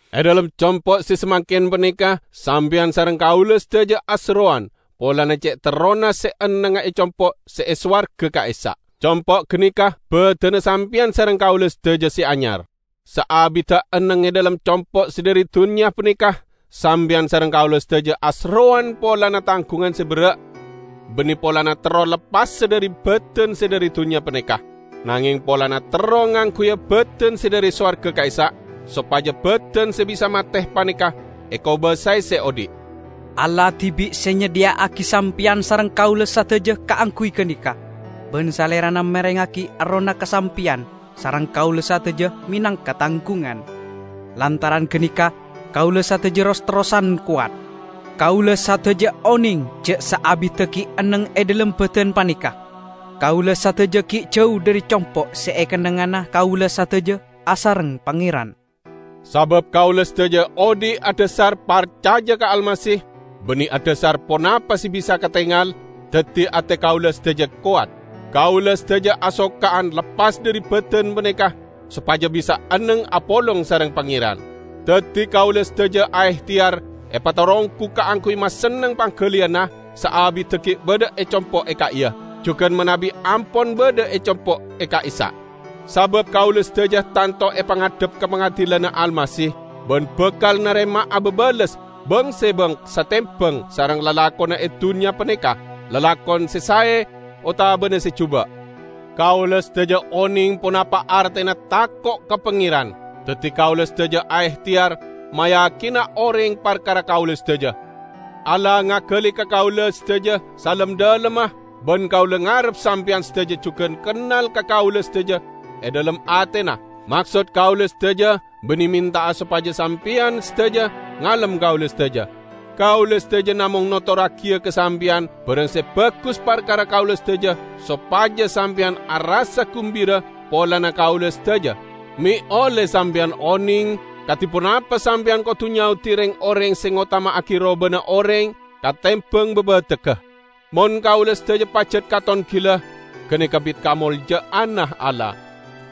E dhalem compo' se samangken paneka sampeyan sareng kaula sadaja aserrowan polana ce' terrona se ennengnga e compo' se e sowarga ka'issa'. Compo' ganeka badanna sampeyan sareng kaula sadaja se anyar. Saabidda enneng e dhalem compo' se dhari dunnya paneka, sampeyan sareng kaula sadaja aserrowan polana tanggungan se berra'. Banne polana terro leppasa dhari badan se dhari dunnya paneka, nangeng polana terro ngangguya badan se dhari sowarga ka'issa', sopaja badan se bisa mate paneka ekobasae se odhi'. Allah dibi' se nyadhiya'agi sampeyan sareng kaula sadaja kaangguy ganeka, ban Salerana marengngagi Errohna ka sampeyan sareng kaula sadaja menangka tanggungan. Lantaran ganeka kaula sadaja ros-terrosan kowat. Kaula sadaja oneng ja' saabidda gi' enneng e dhalem badan paneka, kaula sadaja gi' jau dhari compo' se ekennengngana kaula sadaja asareng Pangeran. Sabab kaula sadaja odhi' adhasar parcaja ka Almasih, banne adhasar ponapa se bisa katengal, daddi ate kaula sadaja kowat. Kaula sadaja asoka'an leppas dhari badan paneka, sopaja bisa enneng apolong sareng Pangeran. Daddi kaula sadaja aehteyar epataronggu kaangguy masenneng panggaliyanna, saabidda gi' badha e compo' e ka'iya, jugan manabi ampon badha e compo' e ka'issa'. Sabab kaula sadaja tanto epangadhep ka pangadilanna Almasih, ban bakal narema'a babales bang-sebang satembang sareng lalakonna e dunnya paneka -- lalakon se sae otabana se juba'. Kaula sadaja oneng ponapa artena tako' ka Pangeran, daddi kaula sadaja aehteyar mayakina oreng parkara kaula sadaja. Allah ngagali ka kaula sadaja salem-dhalemma, ban kaula ngarep sampeyan sadaja jugan kennal ka kaula sadaja e dhalem atena. Maksod kaula sadaja banne menta'a sopaja sampeyan sadaja ngalem kaula sadaja. Kaula sadaja namong notorragiya ka sampeyan barang se bagus parkara kaula sadaja sopaja sampeyan arassa gumbira polana kaula sadaja, me' olle sampeyan oneng kadi ponapa sampeyan kodu nyaodi reng-oreng se ngotama'agi robana oreng katembang babategga. Mon kaula sadaja pajat katon gila, ganeka bit kamolja'anna Allah.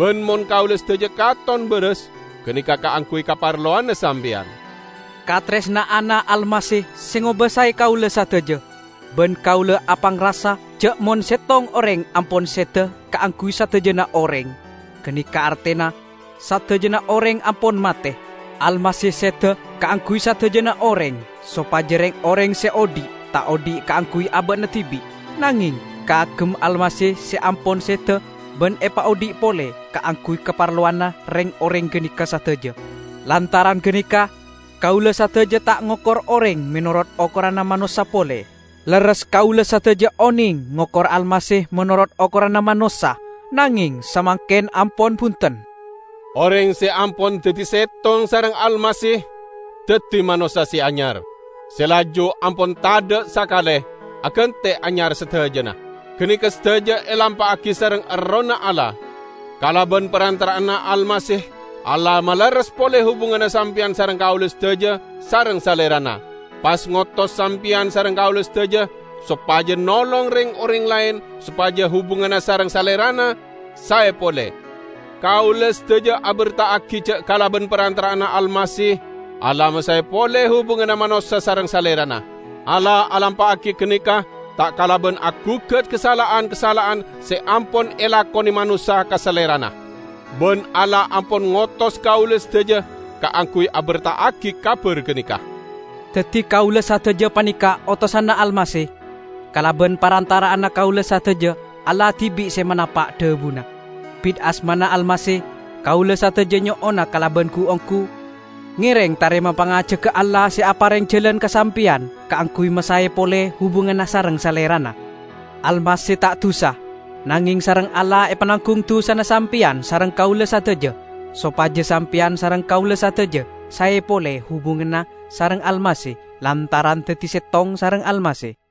Ban mon kaula sadaja katon baras, ganeka kaangguy kaparlowanna sampeyan. Kataresna'anna Almasih se ngobasae kaula sadaja; ban kaula apangrasa ja' mon settong oreng ampon seda kaangguy sadajana oreng, ganeka artena sadajana oreng ampon mate. Almasih seda kaangguy sadajana oreng, sopaja reng-oreng se odhi', ta' odhi' kaangguy aba'na dibi', nangeng kaagem Almasih se ampon seda ban epaodhi' pole kaangguy kaparlowanna reng-oreng ganeka sadaja. Lantaran ganeka, kaula sadaja ta' ngokor oreng menorot okoranna manossa pole. Lerres kaula sadaja oneng ngokor Almasih menorot okoranna manossa, nangeng samangken ampon bunten. Oreng se ampon daddi settong sareng Almasih, daddi manossa se anyar. Se laju ampon tadha' sakale, agante anyar sadajana. Ganeka sadaja elampa'agi sareng Errohna Allah. Kalaban parantara'anna Almasih Allah malerres pole hubunganna sampeyan sareng kaula sadaja sareng Salerana, pas ngotos sampeyan sareng kaula sadaja sopaja nolong reng-oreng laen sopaja hubunganna sareng Salerana sae pole. Kaula sadaja aberta'agi ja' kalaban parantara'anna Almasih Allah masae pole hubunganna manossa sareng Salerana. Allah alampa'agi ganeka ta' kalaban agugat kasala'an-kasala'an se ampon elakone manossa ka Salerana. Ban Allah ampon ngotos kaula sadaja kaangguy aberta'agi kabar ganeka. Daddi kaula sadaja paneka otosanna Almasih. Kalaban parantara'anna kaula sadaja Allah dibi' se manapa' dhabuna. Bit asmana Almasih, kaula sadaja nyo'ona kalaban gu-onggu, ngereng tarema pangajagga Allah se apareng jalan ka sampeyan kaangguy masae pole hubunganna sareng Salerana. Almasih ta' dusa, nangeng sareng Allah epananggung dusana sampeyan sareng kaula sadaja, sopaja sampeyan sareng kaula sadaja sae pole hubunganna sareng Almasih lantaran daddi settong sareng Almasih.